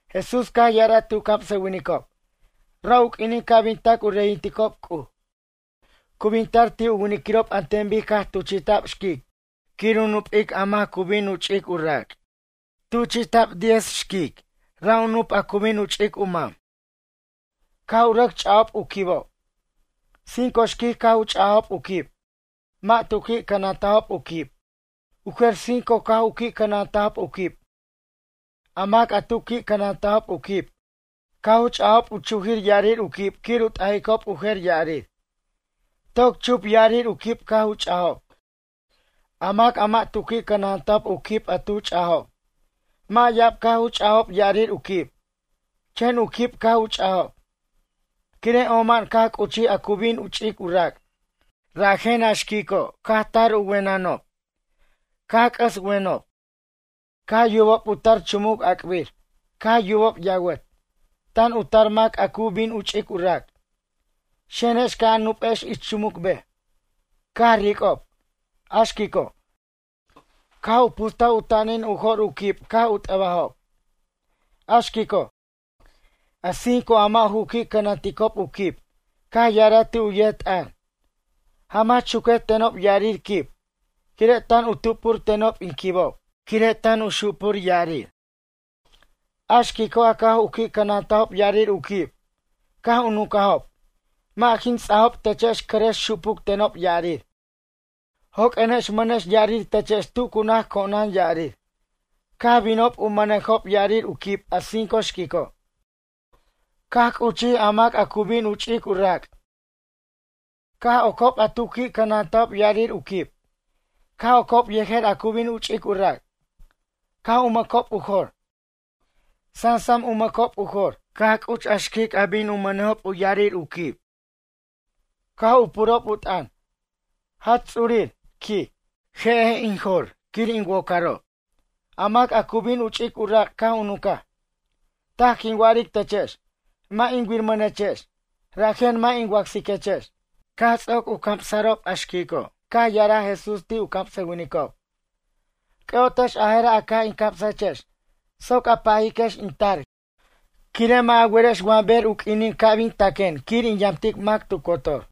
Jesús caj ya'araj ti' u camsʌwinicob: ―Ra' u q'uinin ca' bin tac u reyinticob C'uj. Cu bin tar ti' u winiquirob an ten bic caj tuchi'taj xquic quir u nupic a mac a cu bin u ch'ic u rac'. Tuchi'ta' xquic diez, ra' u nup' a cu bin u ch'ic u mam. Caj u rʌc ch'a'ob u quibob. Cinco xquic caj u ch'ajob u quib. Mʌ' tu qui' cʌnantajob u quib. U jer cinco caj u qui' cʌnantajob u quib. A mac a tu qui' cʌnantajob u quib, caj u ch'ajob u chujir ya'arir u quib quir u t'ajicob u jer ya'arir. Toc chup ya'arir u quib caj u ch'ajob. A mac a mʌ' tu qui' cʌnantajob u quib a tu ch'ajob. Mʌ' ya'ab caj u ch'ajob ya'arir u quib. Chen u quib caj u ch'ajob. Quire' oma'an caj c'uchij a cu bin u ch'ic u rac', rajen a xquico', caj tar u wenʌnob. Caj c'ʌs wenʌneb. Caj yubob u tar chumuc ac'bir. Caj yubob yawʌt: “Tan u tar a mac a cu bin u ch'ic u rac'. Xenex ca' a nupex ich chumuc bej.” Caj ric'ob, a xquico', caj u pustaj u tanin u jo'r u quib caj u t'ʌbajob. A xquico', a cinco a mʌ' u qui' cʌnanticob u quib, caj ya'araj ti' u yet t'ʌn: “Jamach chuquej tenob ya'arir quib, quire' tan u tup'ur tenob in quibob, quire' tan xupur ya'arir.” A xquico' a caj u qui' cʌnantajob ya'arir u quib. Caj u nuncajob: “Mʌ' jin ts'ajob techex cʌrʌx xupuc tenob ya'arir. Joq'uenex mʌnex ya'arir techex tu cu naj co'onan ya'arir.” Caj binob u mʌnejob ya'arir u quib a cinco xquico'. Caj c'uchij a mac a cu bin u ch'ic u rac'. Caj ocob a tu qui' cʌnantajob ya'arir u quib. Caj ocob yejer a cu bin u ch'ic u rac'. Caj u mʌcob u jor. Sansam u mʌcob u jor, caj c'uch a xquic a bin u mʌnejob u ya'arir u quib. Caj u purob u t'ʌn: “Jach ts'urir ―quij―. Je'ej in jor quir in wocarob.” A mac a cu bin u ch'ic u rac' caj u nuncaj: “Taj quin wa'aric techex. Mʌ' in wirmʌnechex, rajen mʌ' in wacsiquechex.” Caj ts'oc u camsa'rob a xquico' caj ya'araj Jesús ti' u camsʌwinicob: ―C'ʌ'otex a jera' a caj in camsajechex soc a pajiquex in tar, quire' mʌ' a werex wa ber u q'uinin ca' bin taquen quir in yamtic mac tu cotor.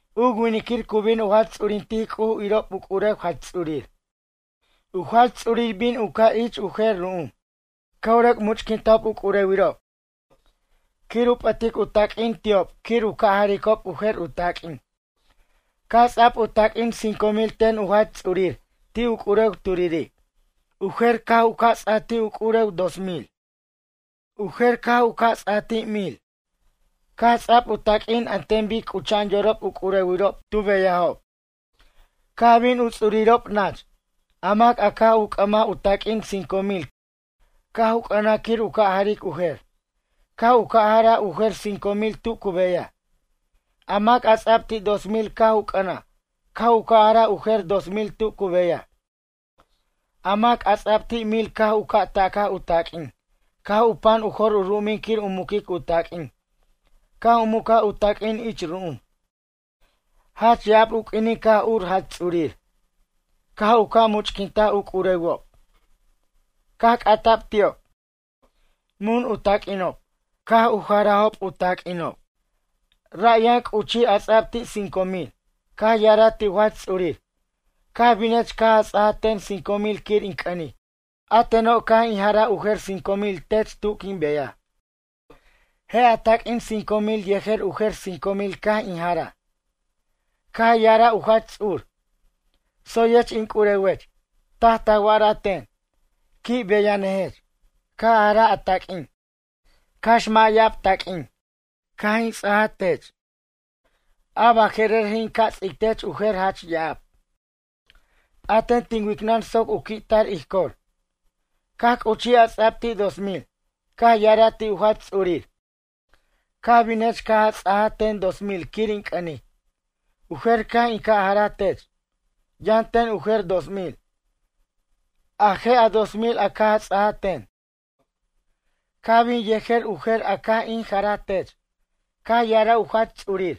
’U winiquir cu bin u jach ts'urintic C'uj irob u c'urew jach ts'urir. U jach ts'urir bin u ca' ich u jer ru'um. Caj u rʌc much'quintaj u c'urewirob quir u p'ʌtic u taq'uin ti'ob quir u ca' jaricob u jer u taq'uin. ’Caj ts'a'b u taq'uin cinco mil ten u jach ts'urir ti' u c'urew turiri'. U jer caj u ca' ts'a'b ti' u c'urew dos mil. U jer caj u ca' ts'a'b ti' mil. Caj ts'a'b u taq'uin an ten bic c'ucha'an yorob u c'urewirob tu beyajob. Caj bin u ts'urirob nach. A mac a caj u c'ʌmaj u taq'uin cinco mil caj u c'ʌnaj quir u ca' jaric u jer. Caj u ca' jaraj u jer cinco mil tu cu beyaj. A mac a ts'a'b ti' dos mil caj u c'ʌnaj. Ca' u ca' jaraj u jer dos mil tu cu beyaj. A mac a ts'a'b ti' mil caj u ta'caj u taq'uin. Caj u pan u jor u ru'um quir u muquic u taq'uin. Caj u mucaj u taq'uin ich ru'um. ’Jach ya'ab u q'uinin caj ur jach ts'urir. Caj u ca' much'quintaj u c'urewob. Caj c'ata'b ti'ob: “Mun u taq'uinob.” Caj u jarajob u taq'uinob. Ra' yʌn c'uchij a ts'a'b ti' cinco mil, caj ya'araj ti' u jach ts'urir: “Caj binech caj a ts'aja ten cinco mil quir in c'ʌnic. A teno' caj in jaraj u jer cinco mil tech tu quin beyaj. Je' a taq'uin cinco mil yejer u jer cinco mil caj in jaraj.” Caj ya'araj u jach ts'ur: “Tsoyech in c'urewech. Taj ta wa'araj ten. Qui' beyanʌjech. Caj a jaraj a taq'uin, cax mʌ' ya'ab taq'uin, caj in ts'aj tech. A baje'rer je' in ca' ts'ic tech u jer jach ya'ab. P'aten tin wicnʌn soc u qui'tar ij cor.” Caj c'uchij a ts'a'b ti' dos mil. Caj ya'araj ti' u jach ts'urir: “Caj binech caj a ts'ajaj ten dos mil quir in c'ʌnic. U jer caj in ca' jaraj tech. Yʌn ten u jer dos mil. A je' a dos mil a caj a ts'ajaj ten. Caj bin yejer u jer a caj in jaraj tech.” Caj ya'araj u jach ts'urir: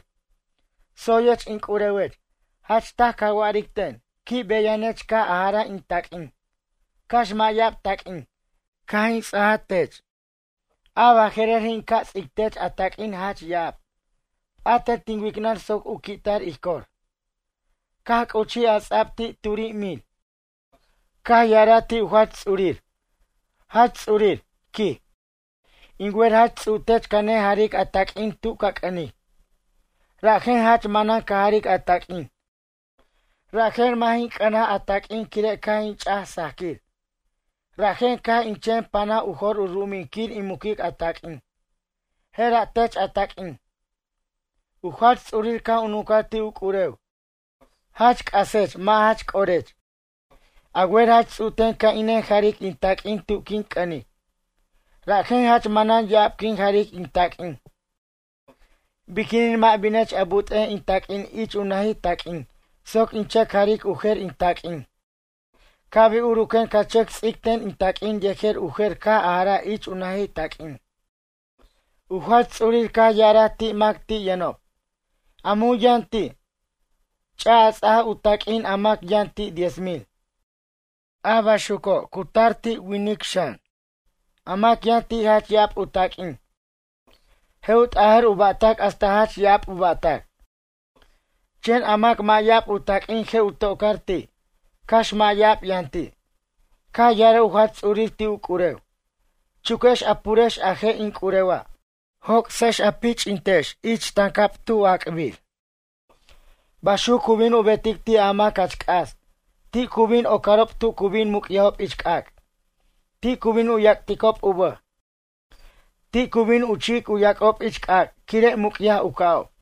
“Tsoyech in c'urewech. Jach taj ca wa'aric ten. Qui' beyanʌjech caj a jaraj in taq'uin, cax mʌ' ya'ab taq'uin, caj in ts'a tech. A baje'rer je' in ca' ts'ic tech a taq'uin jach ya'ab. P'aten tin wicnʌn soc u qui'tar ij cor.” Caj c'uchij a ts'a'b ti' turi' mil caj ya'araj ti' u jach ts'urir: “Jach ts'urir, quij. In wer jach ts'u'tech ca nejaric a taq'uin tu ca c'ʌnic. Rajen jach manan ca jaric a taq'uin. Rajen mʌ' jin c'ʌnaj a taq'uin quire' caj in ch'aj sajquir. Rajen caj in chen panaj u jor u ru'umin quir in muquic a taq'uin. Jera' tech a taq'uin.” U jach ts'urir caj u nuncaj ti' u c'urew: “Jach c'asech mʌ' jach c'orech. A wer jach ts'u'ten ca' in nejaric in taq'uin tu quin c'ʌnic. Rajen jach manan ya'ab quin jaric in taq'uin. Biquinin mʌ' binech a but'ej in taq'uin ich u najitaq'uin soc in chʌc jaric u jer in taq'uin. Ca' bin uruquen ca chʌc ts'ic ten in taq'uin yejer u jer caj a jaraj ich u najitaq'uin?” U jach ts'urir caj ya'araj ti' mac ti' yʌnob: “A mun yʌn ti', ch'a, a ts'a u taq'uin a mac yʌn ti' diez mil. A baxuco' cu tar ti' winic xan. A mac yʌn ti' jach ya'ab u taq'uin. Je' u t'ajʌr u ba'tac hasta jach ya'ab u ba'tac. Chen a mac mʌ' ya'ab u taq'uin je' u tocar ti', cax mʌ' ya'ab yʌn ti'.” Caj ya'araj u jach ts'urir ti' u c'urew: “Chuquex a purex a je' in c'urewa'. Joc'sex a pich'intex ich tancab tu ac'bir.” Baxuc cu bin u betic ti' a mac jach c'as, ti' cu bin ocarob tu cu bin muc'yajob ich c'ac'. Ti' cu bin u yac'ticob u bʌj. Ti' cu bin u chi'ic u yac'ob ich c'ac' quire' muc'yaj u ca'ob.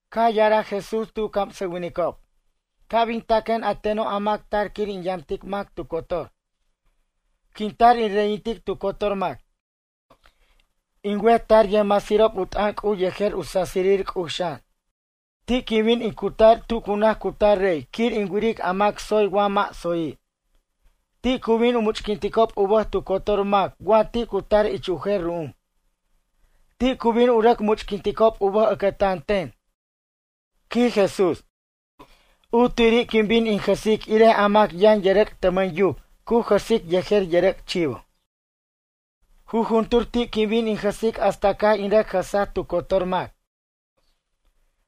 Caj ya'araj Jesús ti' u camsʌwinicob: ―Ca' bin taquen a teno' a mac tar quir in yamtic mac tu cotor. Quin tar in reyintic tu cotor mac. In wet tar yʌjmasirob u t'ʌn C'uj yejer u sasirir C'uj xan. Ti' quin bin in cutar tu cu naj cutar rey quir in wiric a mac tsoy wa mʌ' tsoyi'. Ti' cu bin u much'quinticob u bʌj tu cotor mac wa ti' cu tar ich u jer ru'um. Ti' cu bin u rʌc much'quinticob u bʌj ʌcʌtan ten ―quij Jesús―. U tiri' quin bin in jʌsic irij a mac yʌn yʌrʌc' tʌmʌn yuc cu jʌsic yejer yʌrʌc' chivo. Jujuntur ti' quin bin in jʌsic hasta caj in rʌc jʌsaj tu cotor mac.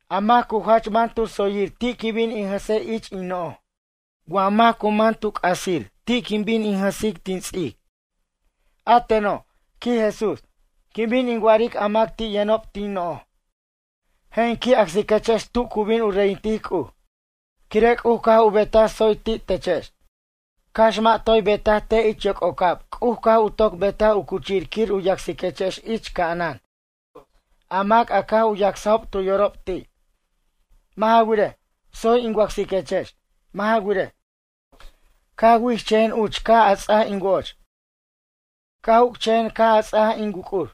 A mac cu jach man tu tsoyir ti' quin bin in jʌsej ich in no'j. Wa mac cu man tu c'asir ti' quin bin in jʌsic tin ts'ic. A teno' ―quij Jesús―, quin bin in wa'aric a mac ti' yʌnob tin no'j: “Je' in qui' acsiquechex tu cu bin u reyintic C'uj, quire' C'uj caj u betaj tsoy ti' techex. Cax mʌ' toy betaj te' ich yoc'ocab C'uj caj u toc betaj u cuchir quir u yacsiquechex ich ca'anan a mac a caj u yacsajob tu yorob ti'. Mʌ' ja wirej, tsoy in wacsiquechex. Mʌ' ja wirej, caj wichʌjen uch caj a ts'aj in wo'och. Caj uc'chʌjen caj a ts'aj in wuc'ur.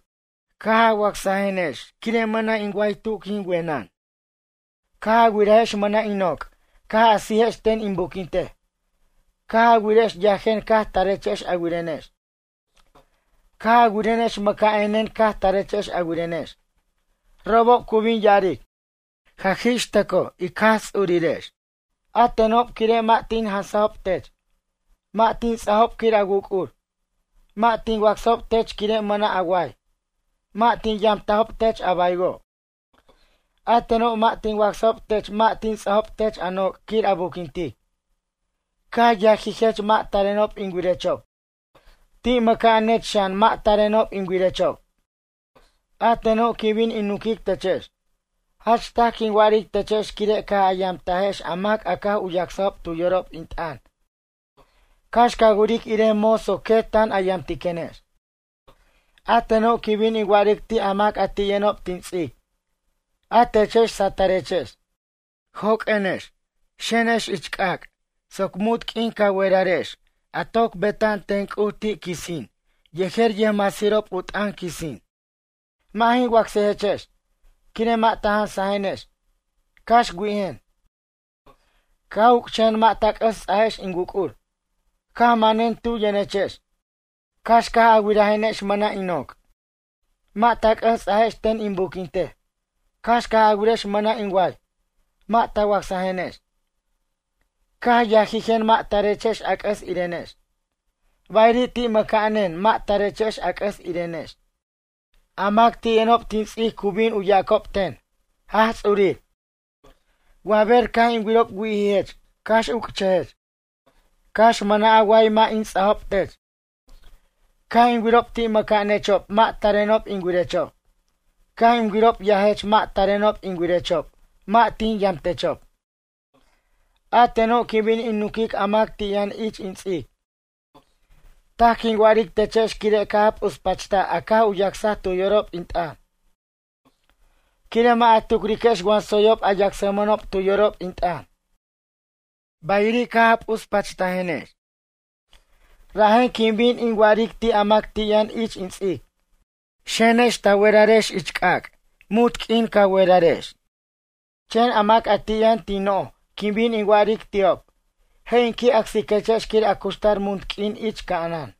Caj a wacsajenex quire' mʌna' in way tu quin wenen. Caj a wirajex mʌna' in noc' caj a sijex ten in buquintej. Caj a wirex yajen caj tarechex a wirenex. Caj a wirenex mʌca'anen caj tarechex a wirenex.” Robob cu bin ya'aric: “Jaj ix tʌcoj ic Jaj Ts'urirex. A tenob quire' mʌ' tin jansajob tech. Mʌ' tin ts'ajob quir a wuc'ur. Mʌ' tin wacsajob tech quire' mʌna' a way. Mʌ' tin yamtajob tech a baywo'. A tenob mʌ' tin wacsajob tech mʌ' tin ts'ajob tech a noc' quir a buquintic. Caj yajijech mʌ' tarenob in wirechob. Ti' mʌca'anech xan mʌ' tarenob in wirechob.” A teno' quin bin in nunquic techex: “Jach taj quin wa'aric techex quire' caj a yamtajex a mac a caj u yacsajob tu yorob in t'ʌn cax ca wiric irej moso quet tan a yamtiquenex.” ’A teno' quin bin in wa'aric ti' a mac a ti' yʌnob tin ts'ic: A techex satʌrechex. Joq'uenex, xenex ich c'ac' soc munt q'uin ca werarex a toc beta'an ten C'uj ti' quisin yejer yʌjmasirob u t'ʌn quisin. Mʌ' jin wacsajechex, quire' mʌ' ta jansajenex, cax wi'ijen. Caj uc'chʌjen mʌ' ta c'ʌs ts'ajex in wuc'ur. Caj manen tu yʌnechex, cax caj a wirajenex mʌna' in noc', mʌ' ta c'ʌs ts'ajex ten in buquintej. Cax caj a wirex mʌna' in way, mʌ' ta wacsajenex. Caj yajijen mʌ' tarechex a c'ʌs irenex. Bayiri' ti' mʌca'anen, mʌ' tarechex a c'ʌs irenex. A mac ti' yʌnob tin ts'ic cu bin u yacob ten: “Jaj Ts'urir, wa ber caj in wirob wi'ijech cax uc'chʌjech. Cax mʌna' a way mʌ' in ts'ajob tech. Caj in wirob ti' mʌca'anechob mʌ' tarenob in wiriquechob. Caj in wirob yajech mʌ' tarenob in wirechob mʌ' tin yamtechob?” A teno' quin bin in nunquic a mac ti' yʌn ich in ts'ic: “Taj quin wa'aric techex quire' caj a p'uspachtaj a caj u yacsaj tu yorob in t'ʌn. Quire' mʌ' a tucriquex wa tsoyob a yacsmʌnob tu yorob in t'ʌn. Bayiri' caj u p'uspachtajenex.” Rajen quin bin in wa'aric ti' a mac ti' yʌn ich in ts'ic: “Xenex ta werarex ich c'ac' munt q'uin ca werarex.” Chen a mac ti' yʌn tin no'j quin bin in wa'aric ti'ob: “Je' in qui' acsiquechex quir a cuxtar munt q'uin ich ca'anan.”